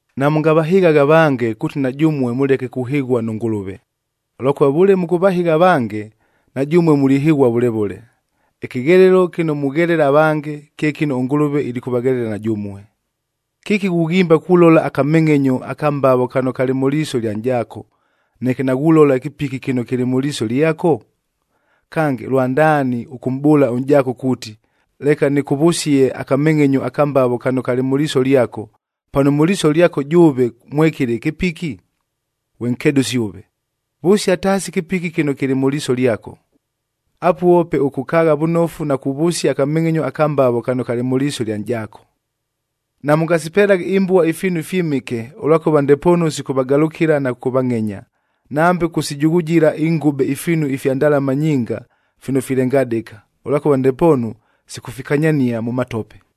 “Namʉngavahɨghaghe avange kuuti na jʉmue mʉleke kuhɨghua nʉ Ngʉlʉve, ʉlwakʉva vʉle mʉkʉvahɨgha avange, na jʉmue mulihɨghua vʉle vʉle. Ɨkɨghelelo kɨno mughelela avange, kye kɨno ʉNgʉlʉve ilikʉvaghelela na jʉmue. “Kɨki ghughimba kulola akamengʼenyo aka mbavo kano kalɨ mʉ liiso ɨlya nʼjaako, neke naghulola ɨkɨpiki kɨno kɨlɨ mʉ liiso lyako? Kange, lwandaani ʉkʉmʼbʉʉla ʉnʼjaako kuuti, ‘Leka nɨkʉvʉsie akamengʼenyo aka mbavo kano kalɨ mʉ liiso lyako,’ pano mʉ liiso lyako jʉʉve mwekɨlɨ ɨkɨpiki? Ghwe nkedʉsi ʉve! Vʉsia taasi ɨkɨpiki kɨno kɨlɨ mʉ liiso lyako. Apuo pe ʉkʉkaagha vʉnofu na kuvʉsia akamengʼenyo aka mbavo kano kalɨ mʉ liiso lya nʼjaako! “Namʉngasipelaghe imbua ifiinu ifyɨmɨke, ʉlwakʉva ndepoonu sikʉvagalʉkɨla na kʉkʉvangʼenya; nambe kʉkʉsijughujila ingʉbe ifiinu ifya ndalama nyinga fino filengadɨka,a ʉlwakʉva ndepoonu sikʉfikanyania mʉ matope.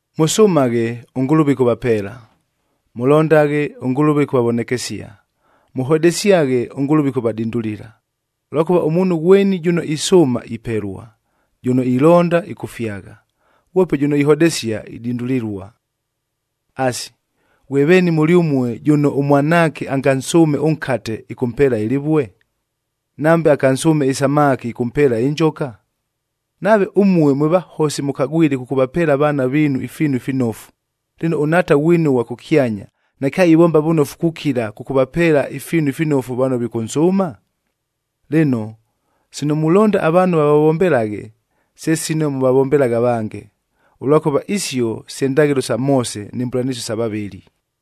“Mʉsʉmaghe, ʉNgʉlʉve ɨkʉvapeela; mʉlondaghe, ʉNgʉlʉve ɨkʉvavonekesia; mʉhodesyaghe, ʉNgʉlʉve ɨkʉvadindulila. Ʉlwakʉva ʉmuunhu ghweni jʉno isʉʉma, ipelua; jʉno ilonda, ɨkʉfyagha; ghwope jʉno ihodesia, idindulilua. “Asi, ghwe veeni mʉlyʉmue, jʉno ʉmwanaake angansʉʉme ʉnkate, ɨkʉmpeela ɨlɨvue? Nambe angansʉʉme ɨsamaki ɨkʉmpeela ɨnjoka? Nave ʉmue, mwe vahosi mʉkagwile kʉkʉvapeela avaana viinu ifiinu ifinofu, lɨno ʉNhaata ghwinu ʉghwa kʉkyanya, nakyaivomba vʉnofu kukila, kʉkʉvapeela ifiinu ifinofu vano vikʉnsʉʉma? “Lɨno, sino mulonda avaanhu vavavombelaghe, se sino mʉvavombelaghe avange. Ʉlwakʉva isio se ndaghɨlo sa Moose ni mbʉlanɨsio sa vavɨli.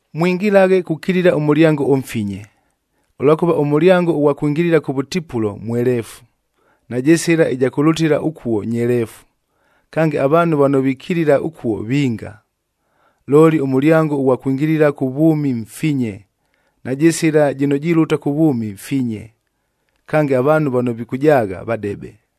“Mwingilaghe kukilila ʉmʉlyango ʉmfinye, ʉlwakʉva ʉmʉlyango ʉghwa kwingilila kʉvʉtipulo mweleefu, najɨ sɨla ɨja kʉlʉtɨla ʉkuo nyeleefu. Kange, avaanhu vano vikilila ʉkuo, vinga. Looli ʉmʉlyango ʉghwa kwingilila kʉ vwʉmi mfinye, najɨ sɨla jɨno jilʉta kʉ vwʉmi finye, kange avaanhu vano vikʉjaagha, vadebe.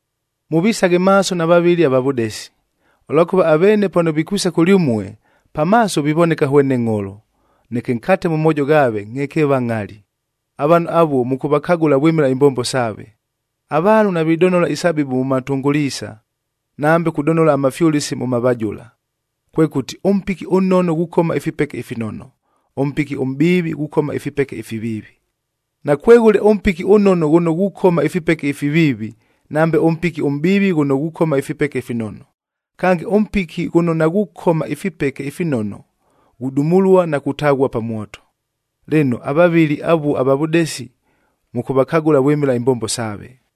“Mʉvisaghe maaso na vavɨli ava vʉdesi, ʉlwakʉva aveene pano vikwisa kʉlyʉmue, pa maaso vivoneka hwene ngʼholo, neke nkate mʉ moojo ghaave, ngʼhekeeva ngʼhali. Avaanhu avuo, mʉkʉvakagʉla vwɨmɨla imbombo saave. Avaanhu navidonola isabibu mʉ matunguliisa, nambe kudonola amafyʉlɨsi mʉ mavajʉla. Kwekʉti, ʉmpiki ʉnnono ghukoma ifipeke ifinono, ʉmpiki ʉmʼbiivi ghukoma ifipeke ifiviivi. Nakweghʉle ʉmpiki ʉnnono ghʉno ghukoma ifipeke ifiviivi, nambe ʉmpiki ʉmʼbiivi ghʉno ghukoma ifipeke ifinono. Kange, ʉmpiki ghʉno naghukoma ifipeke ifinono, ghudumulua na kutaghua pa mwoto. Lɨno, avavɨli avuo ava vʉdesi, mʉkʉvakagʉla vwɨmɨla imbombo saave.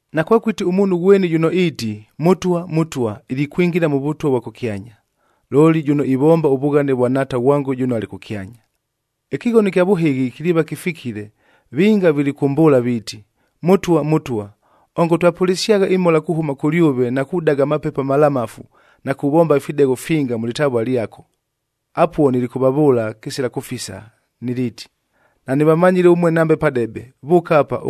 “Nakwekʉti ʉmuunhu ghweni jʉno iiti, ‘Mʉtwa, Mʉtwa,’b ilikwingila mʉ Vʉtwa vwa kʉkyanya, looli jʉno ivomba ʉvughane vwa Nhaata ghwango jʉno alɨ kʉkyanya. Ɨkɨghono ɨkya vʉhɨghi kiliiva kɨfikile, vinga vilikʉmbʉʉla viiti, ‘Mʉtwa, Mʉtwa! Ongo twapʉlɨsyagha ɨmhola kuhʉma kʉlyʉve na kudaga amapepo amalamafu na kuvomba ifidegho finga mʉ lɨtavua lyako!’ Apuo nilikʉvavʉʉla kɨsila kʉfisa, niliiti, ‘Nanɨvamanyile ʉmue nambe padebe! Vʉʉka apa,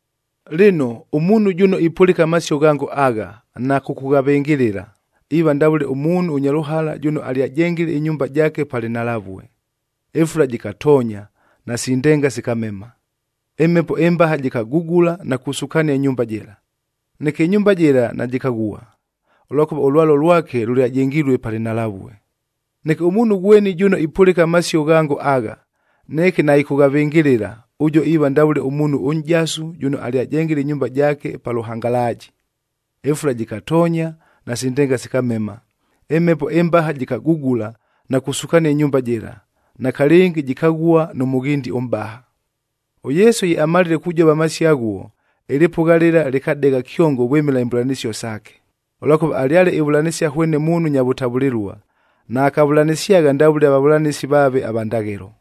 “Lɨno, ʉmuunhu jʉno ipʉlɨka amasio ghango agha na kʉkʉghavɨngɨlɨla, iiva ndavʉle ʉmuunhu ʉnya lʉhala jʉno alyajengile ɨnyumba jaake pa lɨnhalavue. Ɨfula jɨkatoonya, nasi ndenga sikamema. Ɨmhepo ɨmbaha jɨkagugula na kusukania ɨnyumba jɨla. Neke ɨnyumba jɨla najɨkaghua, ʉlwakʉva ʉlwalo lwake lʉlyajengilue pa lɨnhalavue. Neke ʉmuunhu ghweni jʉno ipʉlɨka amasio ghango agha, neke naɨkʉghavɨngɨlɨla, ʉjuo iiva ndavʉle ʉmuunhu ʉnʼjasu jʉno alyajengile ɨnyumba jaake pa lʉhangalaaji. Ɨfula jɨkatoonya, nasi ndenga sikamema. Ɨmhepo ɨmbaha jɨkagugula na kusukania ɨnyumba jɨla, nakalɨngi jɨkaghua nʉ mʉghindi ʉmʼbaha!” ɄYesu ye amalile kujova amasio aghuo, ɨlɨpʉgha lɨla lɨkadegha kyongo vwɨmɨla imbʉlanɨsio saake, ʉlwakʉva alyale ivʉlanɨsia hwene muunhu nya vʉtavʉlɨlua, naakavʉlanɨsyagha ndavʉle avavʉlanɨsi vaave ava ndaghɨlo.